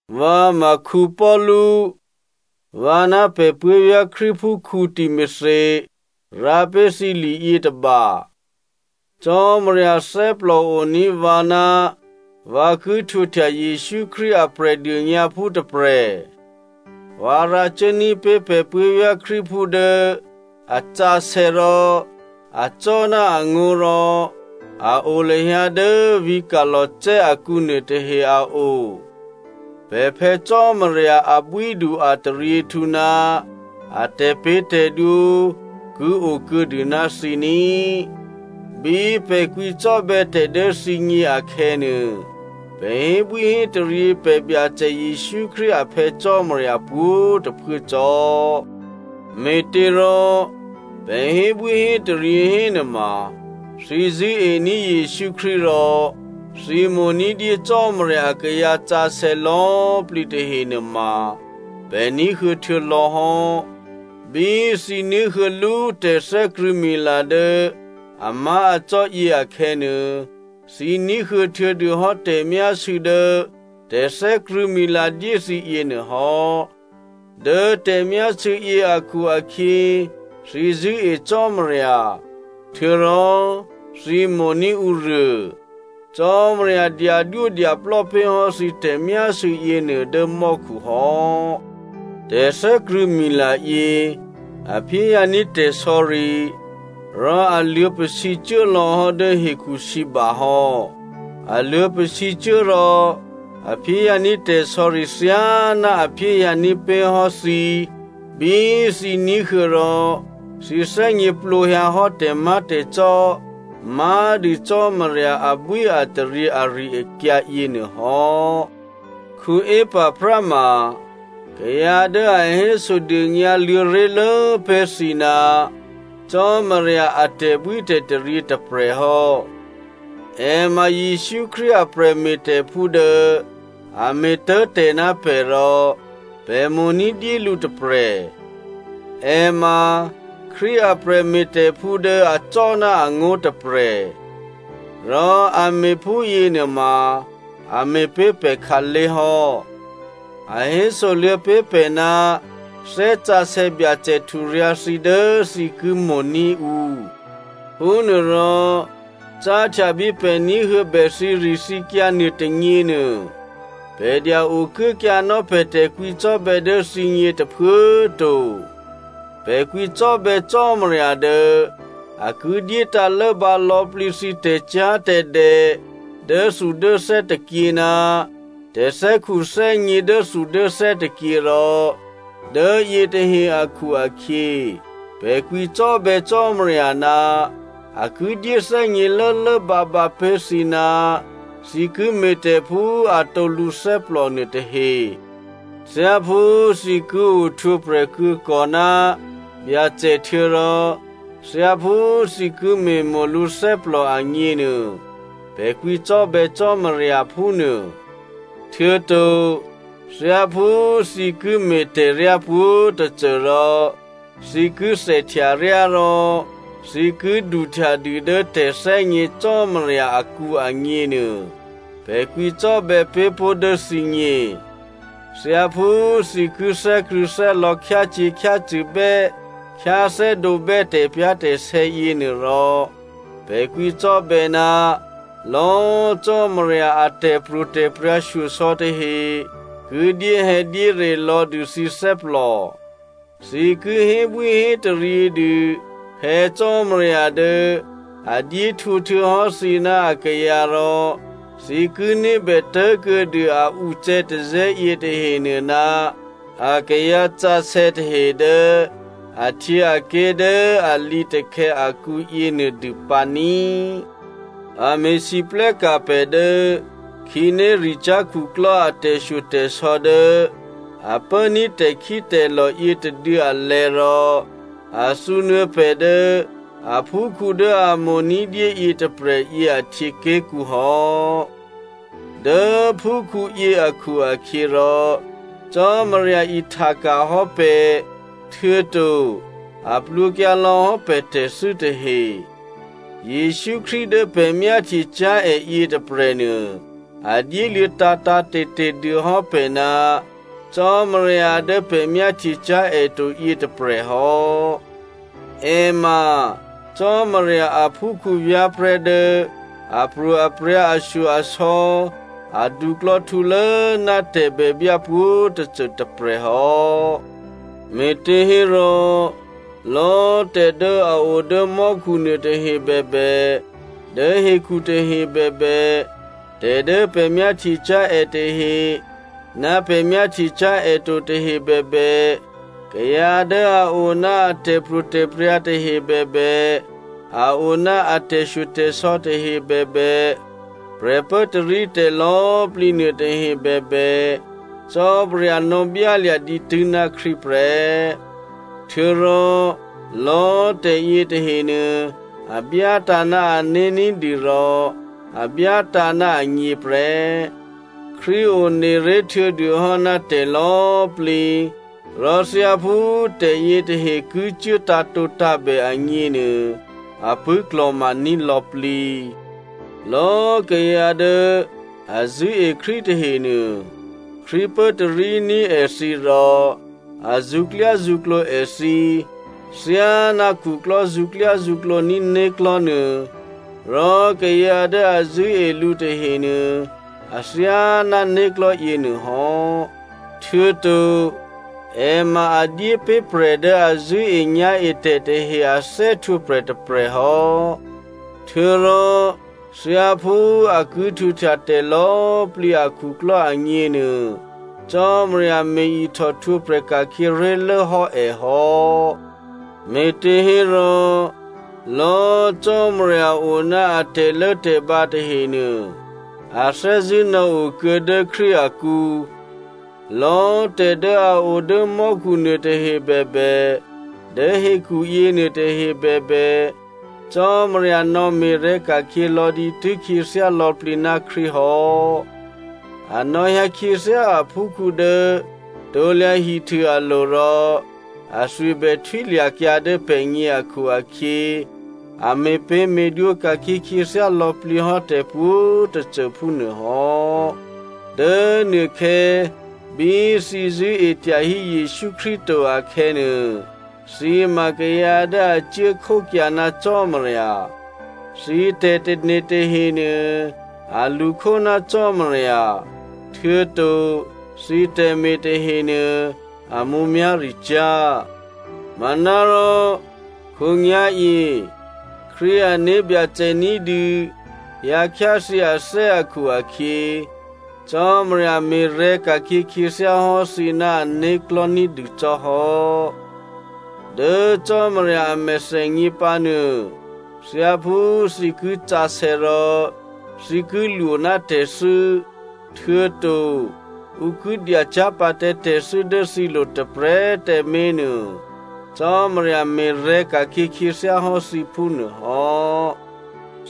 Vǎ ma Paulu, vǎ ná pè̤ puố̤vyá̤ Krístuphú Timothy rǎ pé̤ thǐ li yětôba. Cò́marya thè́plòoní̤ vǎ ná vǎ ki htwǒhtya Jesǔ Krístu a Prè̤dônyǎphú tôprè̤. Vǎ rǎ cuốní̤ pé̤ pè̤ puố̤vyá̤ Krístuphú dố a sǎsè̌ rò acò́ ná angó̤ rò a o lahyǎ dố vǐ̤ Colossae akǔ nuôtahe a o. Pè̤ Phè̌ Cò́marya abwídu ataryěhtǔ ná a tè̤pě̤tè̤dwǒ ki okuô̌dû ná thǐ ní꤮. Bí pè̤ kwǐcò́bè̌ tè̤ dố thǐgně akhè̌nuô, pè̤ hébwíhétaryě pè̤ Byacè Jesǔ Krístu a Phè̌ Cò́marya pwǒ̤꤮ tôphuố cò́. Me̤těrò pè̤ hébwíhétaryě hénuôma, thǐ zṳ̂́ení̤ Jesǔ Krístu rò thǐ mo̤ ní̤dyé Cò́marya akayǎ sǎsè̌ lò̌꤮ plǐ tahenuôma, pè̤ ní̤huô̌ htuô̌lò̌hò́. Bí thǐ ní̤huô̌ lú tè̤thè́krṳ̂̌mila dố amá̤acò́ yě akhè̌nuô, thǐ ní̤huô̌ htuô̌dûhò́ tè̤myásû̌ dố tè̤thè́krṳ̂̌mila dyé thǐ yěnuô hò́. Dố tè̤myásû̌ yě akhu-akhyě, thǐ zṳ̂́e Cò́marya, htuô̌rò thǐ mo̤ní̤ ǔruô. Cò́marya dyadwódyaplò́ pé̤ hò́ thǐ tè̤myásû̌ yěnuô dố mò́khu hò́. Tè̤thè́krṳ̂̌mila yě a phyéhyǎní̤ tè̤sò̌ri rò a luô̌pasǐcuố lò̌hò́ dố hekhusǐba hò́. A luô̌pasǐcuố rò a phyéhyǎní̤ tè̤sò̌ri thyáná a phyéhyǎní̤ pé̤hò́ thǐ bí thǐ ní̤huô̌ rò thǐ thè́gněplǒhyǎ hò́ tè̤má̤tè̤cò́ má̤dû Cò́marya abwíataryě ari-akyǎ yěnuô hò́. Epaphra ma kayǎ dố a hésodônyǎ luô̌ ré̤lố pé̤ thǐ ná Cò́marya a tè̤bwítè̤taryě tôprè̤ hò́. È ma Jesǔ Krístu a prè̤me̤tè̤phú dố a me̤tố̤ tè̤ ná pè̤ rò pè̤ mo̤ ní̤dyé lǔ tôprè̤. È ma Krístu a prè̤me̤tè̤phú dố acò́ ná angó̤ tôprè̤. Rò a me̤ phúyěnuôma a me̤ pé̤ pè̤ khǎlé̤ hò́. A hésoluô̌ pé̤ pè̤ ná Thè́ Sǎsè̌ Byacè hturyǎ̤ thǐ dố thǐ ki mo̤ní̤ ǔ. Phúnuôrò, cáhtya bí pè̤ ní̤huô̌bè thǐrithǐkyǎ nuô tônyěnuô, pè̤ dya-okuốkyǎnò́ pè̤ tè̤kwǐcò́bè̌ dố thǐgně tôphuố꤮ to. Pè̤ kwǐcò́bè̌ Cò́marya dố a ki dyétǎ̤ lốbǎ lò̌plǐ thǐ tè̤cyá̤tè̤dè dốthudốthè́ tôkyě ná tè̤thè́khuthè́gně dốthudốthè́ tôkyě rò dố yětahe akhu-akhyě pè̤ kwǐcò́bè̌ Cò́marya ná a ki dyéthè́gně lốlốbǎbǎ pé̤ thǐ ná thǐ ki me̤tè̤ phú atǒ lǔthè́plò nuôtahe. Thyáphú thǐ ki ohtwǒprè̤ ki kò ná Byacè htuô̌rò thyáphú thǐ ki me̤mo̤ lǔ thè́plò agněnuô, pè̤ kwǐcò́bè̌ Cò́marya phúnuô. Htuô̌to thyáphú thǐ ki me̤tè̤ryá pwǒ̤tôcô, rò thǐ ki thèhtyaryá rò thǐ ki duhtyadû dố tè̤thè́gně Cò́marya akǔ agněnuô, pè̤ kwǐcò́bè̌ pé̤ pó̤ dố thǐgně. Thyáphú thǐ ki thè́krṳ̂̌thè́lò̌ khyácyě̤khyácṳ̂bè́ khyáthè́dǒbè́ tè̤pyá̤tè̤sè̌ yěnuô rò, pè̤ kwǐcò́bè̌ ná lò̌꤮ Cò́marya a tè̤pro̤tè̤prya̤ shyosò̌ tahe ki dyéhè̌dyére lò̌ dû thǐ thè́plò. Thǐ ki hébwíhétaryě dû Phè̌ Cò́marya dố a dyé htwǒ htuô̌hò́ thǐ ná akayǎ rò thǐ ki ní̤bè tố̤kuô̌dû a ucè̌tazè̌ yětahenuô ná akayǎ sǎsè̌ tahe dố ahtyěaké̤ dố a lǐtakhè̌ akǔ yěnuôdû pǎ ní꤮. A me̤lwóhteka̤ pè̤ dố khǐnéricyá̤ khuklò́ a tè̤shyotè̤sò̌ dố a pốní̤ tè̤khítè̤lò̤ yětôduô̌ alè̤̌ rò a thǔnuô̌ pè̤ dố aphúkhǔ dố a mo̤ ní̤dyé yětôprè̤yě ahtyěké̤kǔ hò́. Dố phúkhǔyě akhu-akhyěrò, Cò́marya ihtaka̤ hò́ pè̤, htuô̌to a plwǒkyǎ lò̌hò́ pè̤ tè̤thû́ tahe. Jesǔ Krístu dố pè̤ myáhtyecyá̤ è yětôprè̤nuô a dyéluô̌ tǎ̤tǎ̤te̤te̤ dû hò́ pè̤ ná Cò́marya dố pè̤ myáhtyecyá̤ è to yětôprè̤ hò́. È ma Cò́marya aphúkhǔ vyá̤prè̤́ dố apro̤aprya̤, ashyo-asò̌ a duklò̌htǔlố ná tè̤bèbyá pwǒ̤꤮ tôcô tôprè̤ hò́. Me̤těhérò, lò̌꤮ tè̤dố a o dố mò́khu nuôtahe bèbè, dố hekhu tahe bèbè, tè̤ dố pè̤ myáhtyecyá̤ è tahe ná pè̤ myáhtyecyá̤ è to tahe bèbè, kayǎ dố a o ná a tè̤pro̤tè̤prya̤ tahe bèbè, a o ná a tè̤shyotè̤sò̌ tahe bèbè, prè̤pốtarítè̤ lò̌꤮ plǐ nuôtahe bèbè, Cò́marya nò̌byálya̤ dǐtû́ ná Krístu prè́. Htuô̌rò lò̌꤮ tè̤ yětahenuô a byátǎ̤ ná ané̤ ní̤dû rò a byátǎ̤ ná agně prè́. Krístu one ré̤ htuô̌dûhò́ ná tè̤ lò̌꤮ plǐ, rò thyáphú tè̤yětahe ki cuố tǎ̤tǒtǎ̤bè agněnuô, a pṳ̂́klò̤ma ní̤ lò̌plǐ. Lò̌꤮ kayǎ dố a zṳ̂́e Krístu tahenuô, Krístu pốtaríní̤ èthǐ rò a zṳ̌klyázṳ̌klǒ èthǐ thyáná khuklò́ zṳ̌klyázṳ̌klǒ ní̤ né̤klò̤́ nuô, rò kayǎ dố a zṳ̂́e lǔ tahenuô athyáná né̤klò̤́ yěnuô hò́. Htuô̌to è ma a dyépé̤ prè̤ dố a zṳ̂́enyá̤etè̤ tahe a thè́htwǒprè̤ tôprè̤ hò́. Htuô̌rò thyáphú a ki htwǒhtya tè̤lò̌꤮ plǐ akhuklò́ agněnuô, Cò́marya me̤ ihtòhtwǒprè̤ ka̤khyě ré̤lố hò́ è hò́. Me̤těhérò, lò̌꤮ Cò́marya o ná a tè̤lốtè̤bǎ tahenuô, a thè́zṳ̂́ nò̌okuô̌ dố Krístu akǔ. Lò̌꤮ tè̤ dố a o dố mò́khu nuôtahe bèbè, dố hekhuyěnuô tahe bèbè, Cò́marya nò̌me̤rè̤̌ ka̤khyě lò̌ dǐtû́ khyěthyá lò̌plǐ ná Krístu hò́. A nò̌hyǎ khyáthyě aphúkhǔ dố krusu alo̤ rò athwi bè htwílya̤kyǎ dố pè̤gně akhu-akhyě a me̤pě̤me̤dwǒ ka̤khyě khyěthyá lò̌plǐ hò́ tè̤pwǒ̤꤮ tôcô phúnuôhò́. Dố nuôkhè̌ bí thǐ zṳ̂́e tyahí Jesǔ Krístu to akhè̌nuô, thǐ ma kayǎ dố a cuố khókyǎ ná Cò́marya. Thǐ tè̤tane̤ tahenuô a lṳkhó ná Cò́marya, htuô̌to thǐ tè̤me̤ tahenuô a mǔmyá̤ricyá̤. Manárò khǒnyá̤yě, Krístu ané̤byacè ní̤dû hyǎ khyáthyě athè́ akhu-akhyě, Cò́marya me̤rè̤̌ka̤khyě khyěthyá hò́ thǐ ná ané̤klò̤́ ní̤dû cò́ hò́. Dố Cò́marya a mèthènyě pǎnuô, thyáphú thǐ ki sǎsè̌ rò thǐ ki lwó ná tè̤thû́, htuô̌to ǔ ki dyacyá̤ pǎ tǎ tè̤thû́ dố thǐlo̤ tôprè̤꤮ tǎmé̤ nuô, Cò́marya me̤rè̤̌ ka̤khyě khyěthyáhò́ thǐ phúnuô hò́.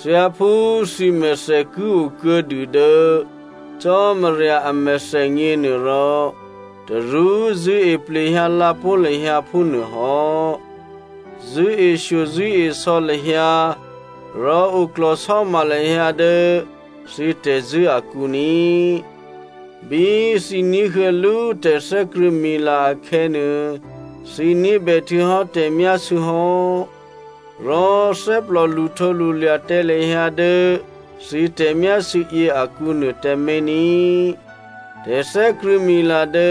Thyáphú thǐmèthè ki o kuô̌dû dố Cò́marya a mèthènyě nuôrò, tarú zṳ̂́e plehyǎ lǎpó̤ lahyǎ phúnuôhò́. Zṳ̂́eshyo zṳ̂́esò̌ lahyǎ, rò oklò̤sò́ma lahyǎ dố thǐ tè̤zṳ̂́ akǔ ní꤮. Bí thǐ ní̤huô̌ lú tè̤thè́krṳ̂̌mila akhè̌nuô, thǐ ní̤bè htuô̌hò́ tè̤myásû̌ hò́. Rò thè́plò lṳhtǒlṳlya̤ tǎ lahyǎ dố thǐ tè̤myásû̌ yě akǔ nuô tǎmé̤ ní꤮. Tè̤thè́krṳ̂̌mila dố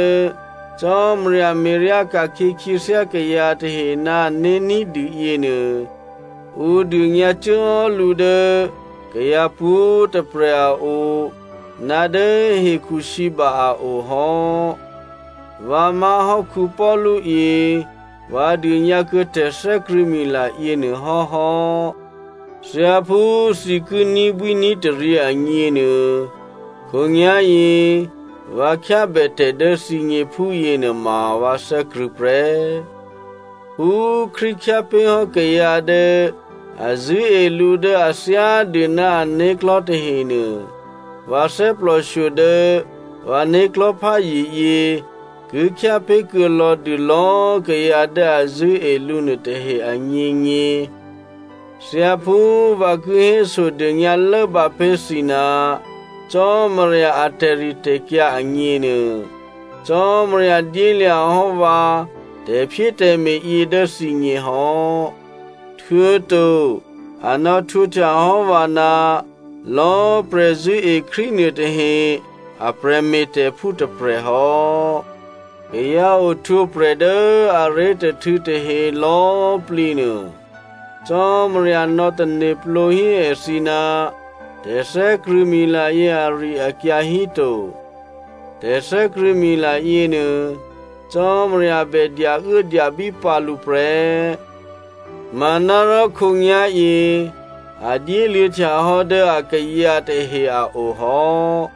Cò́marya me̤ryá ka̤khyě khyěthyá kayǎ tahe ná ané̤ ní̤dû yěnuô, ǔ dônyǎ cuốhò́ lǔ dố kayǎ pwǒ̤꤮ tôprè̤ a o, ná dố hekhu sǐba a o hò́. Vǎ má̤hò́ Paulu yě, vǎ dônyǎ kuô̌ tè̤thè́krṳ̂̌mila yěnuô hò́hò́. Thyáphú thǐ ki ní̤bwíní̤taryě agněnuô khǒnyá̤yě vǎ khyábètè̤ dố thǐgně phúyěnuôma vǎ thè́krṳ̂̌ prè́. Phú Krístu khyá pé̤ hò́ kayǎ dố a zṳ̂́e lǔ dố a thyádû ná ané̤klò̤́ tahenuô, vǎ thè́plòshyo dố vǎ né̤klò̤́pházye yě ki khyá pé̤kuô̌ lò̌dû lò̌꤮ kayǎ dố a zṳ̂́e lǔ nuôtahe agněgně. Thyáphú vǎ ki hésodônyǎ lốbǎ pé̤ thǐ ná Cò́marya a tè̤ritè̤kyǎ agněnuô, Cò́marya dyélya̤ hò́ vǎ tè̤phyétè̤me̤ yě dố thǐgněhò́, htuô̌to a nò̌htwǒhtya hò́ vǎ ná lò̌꤮ prè̤zṳ̂́e Krístu nuôtahe a prè̤me̤tè̤phú tôprè̤ hò́. Kayǎ ohtwǒprè̤ dố aré̤tôhtû̌ tahe lò̌꤮ plǐnuô, Cò́marya nò̌tane̤plǒ hí èthǐ ná tè̤thè́krṳ̂̌mila yě ari-akyǎ híto. Tè̤thè́krṳ̂̌mila yěnuô, Cò́marya bè dyauốdyabí pǎ lǔ prè́, manárò khǒnyá̤yě a dyéluô̌ htyahò́ dố akayǎ tahe a o hò́.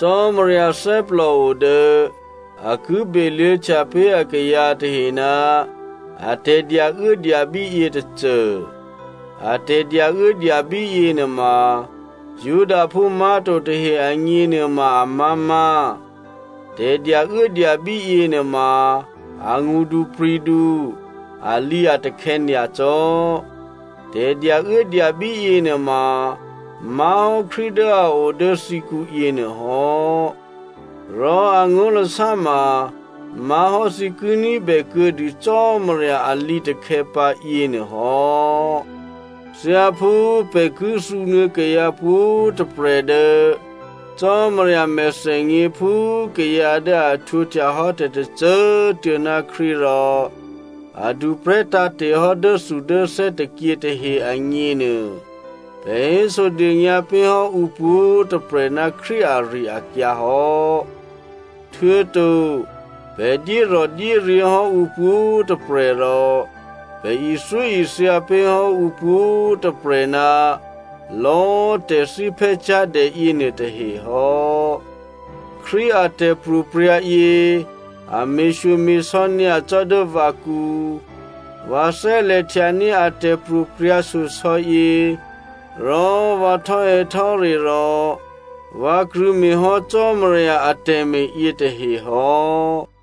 Cò́marya thè́plòo dố a ki beluô̌htya pé̤ akayǎ tahe ná a tè̤dyauốdyabí yětôcô. A tè̤dyauốdyabí yěnuôma Judaphú má̤to tahe agně nuôma amá̤má̤. Tè̤dyauốdyabí yěnuôma a ngṳdupri̤du, alǐatakhè̌ nyacò́. Tè̤dyauốdyabí yěnuôma má̤hò́ Krístu dố a o dố thǐkǔ yěnuôhò́, rò angó̤lasá ma má̤hò́ thǐ ki ní̤bè kuô̌dû Cò́marya a lǐtakhè̌ pǎ, yěnuôhò́. Thyáphú pè̤ ki thǔnuô̌ kayǎ pwǒ̤꤮ tôprè̤ dố Cò́marya mèthènyě phú kayǎ dố a htwǒhtya hò́ tè̤tôcô꤮ tuô̌ ná Krístu rò a duprè̤́ tǎ̤te̤ hò́ dốthudốthè́ tôkyě tahe agněnuô, pè̤ hésodônyǎ pé̤ hò́ ǔ pwǒ̤꤮ tôprè̤ ná Krístu ari-akyǎ hò́, htuô̌to pè̤ dyérò̤dyéryě̤ hò́ ǔ pwǒ̤꤮ tôprè̤, rò pè̤ ithyóithya pé̤ hò́ ǔ pwǒ̤꤮ tôprè̤ ná lò̌꤮ tè̤thíphè́cyá̤dè yěnuôtahe hò́. Krístu a tè̤pro̤prya̤ yě a me̤shyome̤sò̌ nyacò́ dố vǎkǔ. Vǎ thè́lè̤ htyaní̤ a tè̤pro̤prya̤ shyosò̌ yě rò vǎ htò́hè̌htò́re rò vǎ krṳ̂̌me̤hò́ Cò́marya atè̤me̤ yětahe hò́.